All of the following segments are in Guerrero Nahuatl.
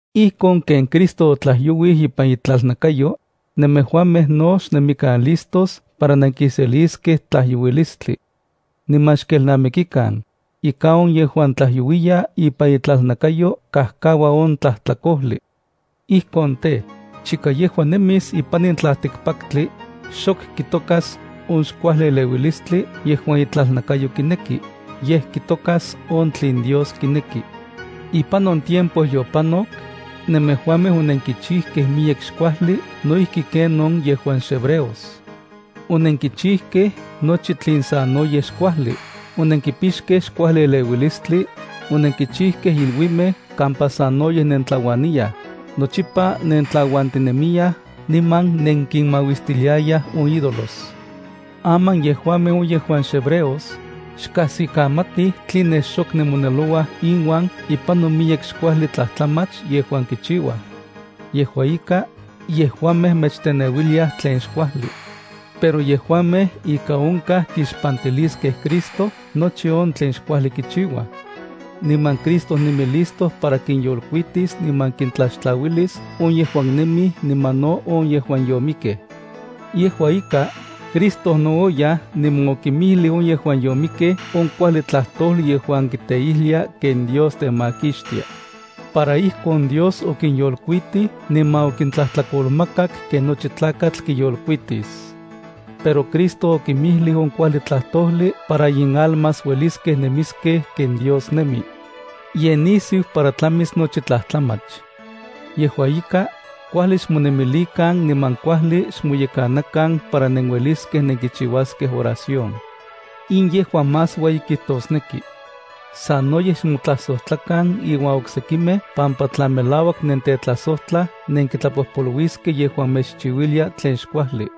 Ijkon ken Cristo otlajyouij ipan itlalnakayo, nemejuamej no xnemikan listos para nenkiseliskej tlajyouilistli. Niman xkelnamikikan, ika on yejuan tlajyouiya ipan itlalnakayo kajkaua on tlajtlakojli. Ijkon tej, chika yejua nemis ipan in tlaltikpaktli, xok kitokas on xkuajli eleuilistli yejuan itlalnakayo kineki, yej kitokas on tlen Dios kineki. Ipan on tiempo yopanok, nemejuamej onenkichijkej miyek xkuajli no ijki ken on yejuan xhebreos. Onenkichijkej nochi tlen sanoyej xkuajli, onenkipixkej xkuajli eleuilistli, onenkichijkej iluimej kampa sanoyej nentlauaniyaj, nochipa nentlauantinemiyaj niman nenkinmauistiliayaj on ídolos. Aman yejuamej on yejuan xhebreos, xkajsikamatij tline xok nemonelouaj inuan ipan on miyek xkuajli tlajtlamach yejuan kichiuaj. Yejua ika, yejuamej mechteneuiliaj tlen xkuajli. Pero yejuamej ika onkaj kixpantiliskej Cristo nochi on tlen xkuajli kichiuaj. Niman Cristo nemi listo para kinyolkuitis niman kintlaxtlauilis on yejuan nemij niman no on yejuan yomikej. Yejua ika, Cristo no oyaj niman okinmijlij on yejuan yomikkej on kuajli tlajtojli yejuan kiteijlia ken Dios temakixtia. Para ijkon Dios okinyolkuitij niman okintlajtlakolmakak ken nochi tlakatl kiyolkuitis. Pero Cristo okinmijlij on kuajli tlajtojli para inalmas ueliskej nemiskej ken Dios nemi. Ye nisiu para tlamis nochi tlajtlamach. Yejua ika, kuajli xmonemilikan niman kuajli xmoyekanakan para nenueliskej nenkichiuaskej oración. In yejua más ueyi kijtosneki. Sanoyej xmotlajsojtlakan iuan oksekimej pampa tla melauak nentetlajsojtlaj nenkitlapojpoluiskej yejuan mechchiuilia tlen xkuajli.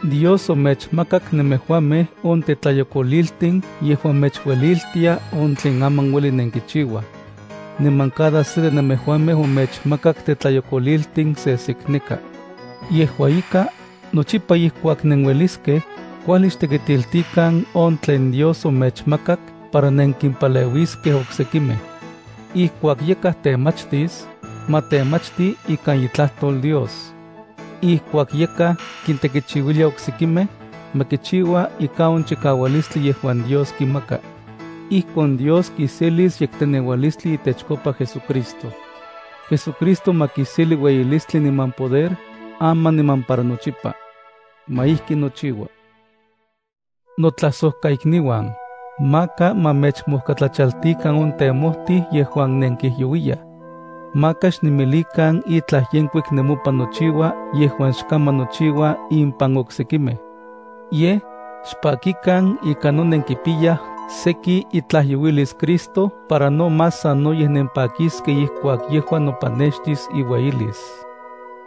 Dios omechmakak nemejuamej on tetlayokoliltin yejuan mechueliltia on tlen aman ueli nenkichiuaj. Niman cada se de nemejuamej omechmakak tetlayokoliltin sesekneka. Yejua ika, nochipa ijkuak nenueliskej, kuajli xtekitiltikan on tlen Dios omechmakak para nenkimpaleuiskej oksekimej. Ijkuak yakaj temachtis, ma temachti ikan itlajtol Dios. Ijkuak yakaj kintekichiuilia oksekimej, ma kichiua ikan on chikaualistli yejuan Dios kimaka. Ijkon Dios kiselis yekteneualistli itechkopa JesuCristo. JesuCristo ma kiselia ueyilistli niman poder aman niman para nochipa. Ma ijki nochiua. Notlajsojkaikniuan, maka ma mechmojkatlachaltikan on temojtij yejuan nenkijyouiyaj. Maka xnemilikan itlaj yenkuik nemopan nochiua yejuan xkaman nochiua impan oksekimej. Yej, xpakikan ika no nenkipiyaj seki itlajyouilis Cristo para no más sanoyej nempakiskej ijkuak yejua nopanextis iueyilis.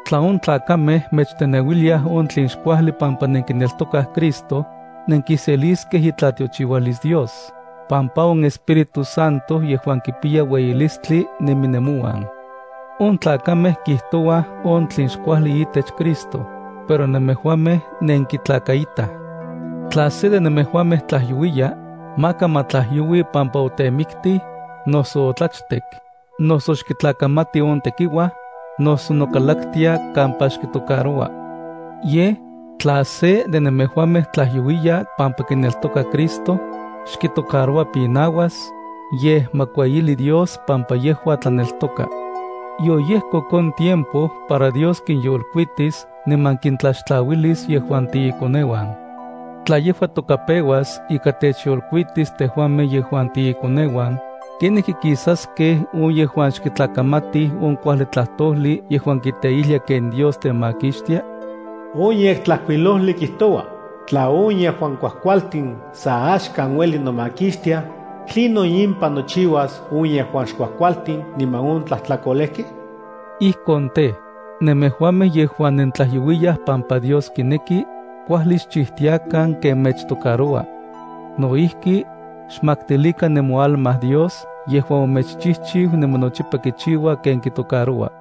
Tla on tlakamej mechteneuiliaj on tlen xkuajli pampa nenkineltokaj Cristo, nenkiseliskej itlatiochiualis Dios, pampa on Espíritu Santo yejuan kipiya ueyilistli nemi nemouan. On tlakamej kijtouaj on tlen xkuajli itech Cristo, pero nemejuamej nenkitlakaitaj. Tla se de nemejuamej tlajyouiya, maka ma tlajyoui pampa otemiktij, noso otlachtek, noso xkitlakamati on tekiuaj, noso nokalaktia kampa xkitocaroua. Yej, tla se de nemejuamej tlajyouiya pampa kineltoka Cristo, xkitocaroua pinauas, yej ma kueyili Dios pampa yejua tlaneltoka. Yoyejkok on tiempo para Dios kinyolkuitis niman kintlaxtlauilis yejuan tiikoneuan. Tla yejua toka peuas ika techyolkuitis tejuamej yejuan tiikoneuan, ¿kenijki kisaskej on yejuan xkitlakamatij on kuajli tlajtojli yejuan kiteijlia ken Dios temakixtia? On Yektlajkuilojli kijtoua: Tla on yejuan kuajkualtin sa axkan uelij nomakixtiaj, ¿tlinon impan nochiuas on yejuan xkuajkualtin niman on tlajtlakolejkej?” Ijkon tej, nemejuamej yejuan nentlajyouiyaj pampa Dios kineki, kuajli xchijtiakan ken mechtocaroua. No ijki, xmaktilikan nemoalma Dios yejuan omechchijchiu niman nochipa kichiua ken kitocaroua.